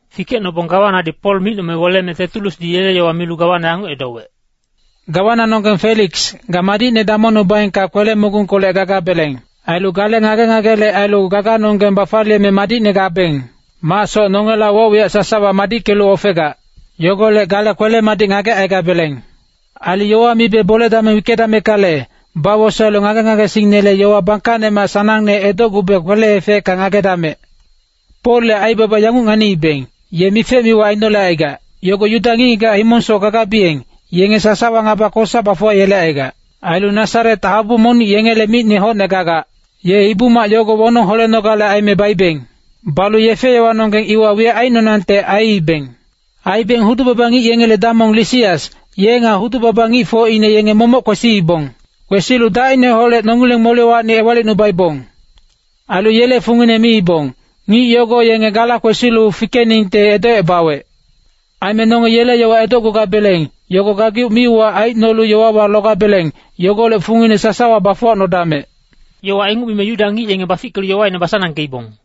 Fikecnobong gawanadi Pol micnome weleme Tetulusdi yele yowa milu gawana yanguc edowec, “Gawananonggeng Feliks, ga madicne damongnubaengka kwele-mogungkolec gagabeleng. Ailu gale ngage-ngagele ailu gaganonggeng bafaliyeme madicne gabeng macsoc nongela woc-wiyac sasawa madickelu ofegac. Yogolec gale kwele-madic ngagecaigabeleng. Ailu yowa mibe bole-dameng wickedameckale, bawosaelu ngage-ngagesingnele yowa bangkacnemac sanangne edocgube kwele-efecka ngagedamec. “Polle aibaba yanguc nganiibeng, ye mife-miwa ainolecaigac, yogo Yuda ngic-ngigac himongsoc gagabiyeng, yenge sasawa ngaba kosa bafuwayelecaigac. Ailu Nasaret habu monic yengele micne hocne gagac. Ye Ibu-mac yogo wonong holenogale aime baibeng. [Balu yefe-yowanonggeng iwa wiyac aicnonangte aiibeng. Aibeng hudu-baba ngic yengele damong Lisias, ye nga hudu-baba ngicfocine yenge momoc kwesiibong. Kwesilu dacineholec nongileng molewacni ewalicnubaibong. Ailu yele fungine miibong, ngic yogo yenge gala kwesilu fikeningte edocebawec.] Aime nonge yele yowa edocgugabeleng, yogo gageuc mi-uwac aicnolu yowawa logabeleng, yogolec fungine sasawa bafuwacnodamec.” Yowa inguc mime Yuda ngic yenge bafickelu yowaine basanangkeibong.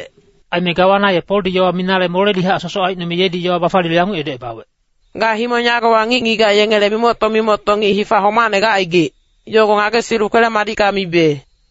Aime gawana ye Poldi yowa minale moledihac sosoc aicnome yedi yowa bafaliyelu yanguc edowec, “Ga himong yagowa ngic-ngigac yengele mimocto-mimocto ngic hifa homacne gacaigic, yogo ngagesilu kwele-madicka mibe.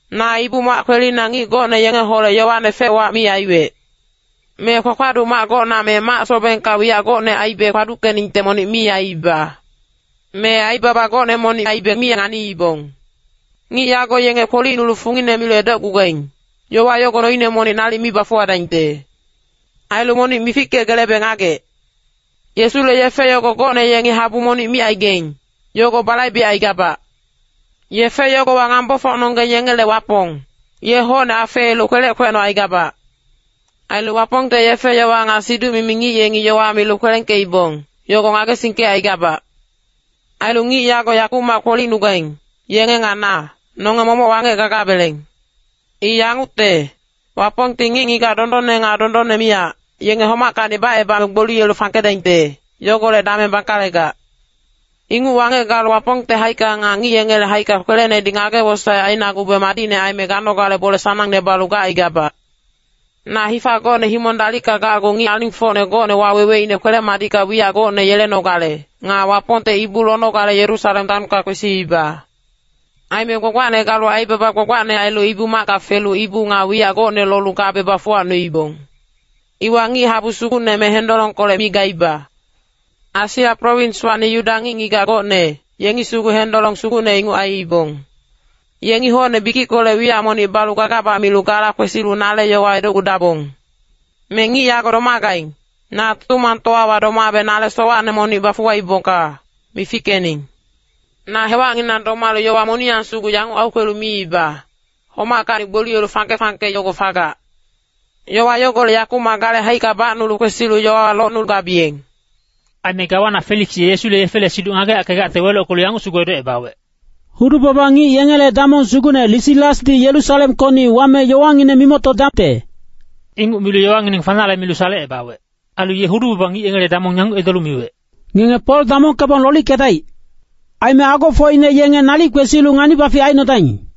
Na Ibu-mac kwelina ngic gocne yengeholec yowane fec-wac mi aiwec. Me kpakpaduc mac gocna me mac-sobengka wiyac gocne aibe kpaduckeningte monic mi aiiba. Me aibaba gocne monic aibe mi nganiibong. Ngic yago yenge kpolicnulu fungine milu edocgugaing, yowa yogo noine monic nalic mi bafuwadaingte. Ailu monic mifickegelebe ngagec. Yesule yefe yogo gocne yengi habu monic micaigaing, yogo balaibecaigabac. Yefe yogowa ngambofocnonggeng yengele Wapong, ye hocne afeelu kwelec kwecnocaigabac. Ailu Wapongte yefe-yowa nga siduc-mimi ngic yengi yowa milu kwelengkeibong, yogo ngagesingkecaigabac. Ailu ngic yago yakumac kpolicnugaing, yenge nga na, nonge momoc wangec gagabeleng. I yangucte, Wapongti ngic-ngigac dondonne nga dondonne miyac, yenge homackacni bacebame gboliyelu fangkedaingte, yogolec dameng bangkalegac. Inguc wangec galu Wapongte haicka nga ngic yengele haicka kwelenedi ngage-wosaec ainagube madicne aime ganogale bole sanangne balu gacaigabac. “Na hifa gocne himong dalicka gacgu ngic alingfocne gocne waweweine kwele-madicka wiyac gocne yelenogale, nga Wapongte ibu lonogale Yerusalem taonka kwesiiba. Aime gbagbacne galu aibaba gbagbacne ailu Ibu-macka felu ibu nga wiyac gocne lolu gabe bafuwacnuibong. Iwa ngic-habu sugucne me hendolongkolec mi gaiba. Asia prowinswacni Yuda ngic-ngigac gocne, yengi sugu hendolong sugucne inguc aiibong. Yengi hocne bikickolec wiyac monic balu gagabac milu gala kwesilu nale yowa edocgudabong. Me ngic yago domagaing, na Tutumangtowawa domabe nale sowacne monic bafuwaibongka, mifickening. Na hewacnginang domalu yowa moniyang sugu yanguc aukwelu miiba, ‘Homackacni gboliyelu fangke-fangke yogo fagac.’ Yowa yogolec yakumac gale haicka bacnulu kwesi yowawa locnugabiyeng.” Aime gawana Feliks ye Yesule yefele siduc ngageyackegacte welockelu yanguc sugu edocebawec, “Hudu-baba ngic yengele damong sugucne Lisiasdi Yerusalemkocni wame yowangineng mimoctodacte.” Inguc milu yowangineng fanale milu salecebawec. Ailu ye hudu-baba ngic yengele damong yanguc edolu miwec, “Ngenge Pol damongkebong lolickedaic. Aime agofocine yenge nalic kwesilu ngani-bafic aicnodaing.”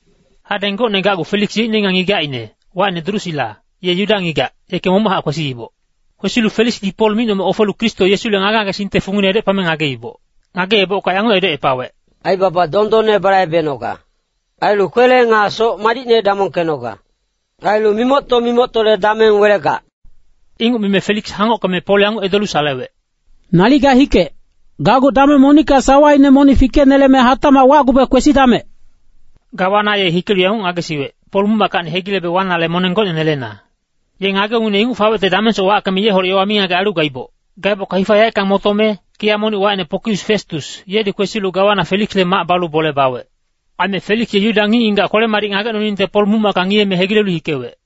Hadeng gocne gacgu Feliks yeicne nga ngigacine, wacine Drusila, ye Yuda ngigac, yeke momochac kwesiiboc. Kwesilu Feliksdi Pol micnome ofelu Kristo Yesule ngage-ngagesingte fungine edocepame ngageiboc. Ngageebocka yanguc edocepawec, “Aibaba dondonne balaibenoga. Ailu kwele nga soc madicne damongkenoga. Ailu mimocto-mimoctole dameng welegac.” Inguc mime Feliks hangockeme Pol yanguc edolu salewec, “Nalic ga hikec, gacgu dameng monicka sawaine monic fikeneleme hatacmac wacgube kwesidamec.” Gawana ye hikelu yanguc ngagesiwec, “Pol muc-mackacni hegilebe wanale moneng gocne nelena.” Ye ngage-ungngine inguc fawecte damengsoc wackeme yeholec yowa mingagec ailu gaiboc. Gaebocka hifa yaeckang motome, kiya monic wacine Pokius Festus, yedi kwesilu gawana Feliksle mac balu bole bawec. Aime Feliks ye Yuda ngic-ngigac kwele-madic ngagecnoningte Pol muc-macka ngiyeme hegilelu hikewec.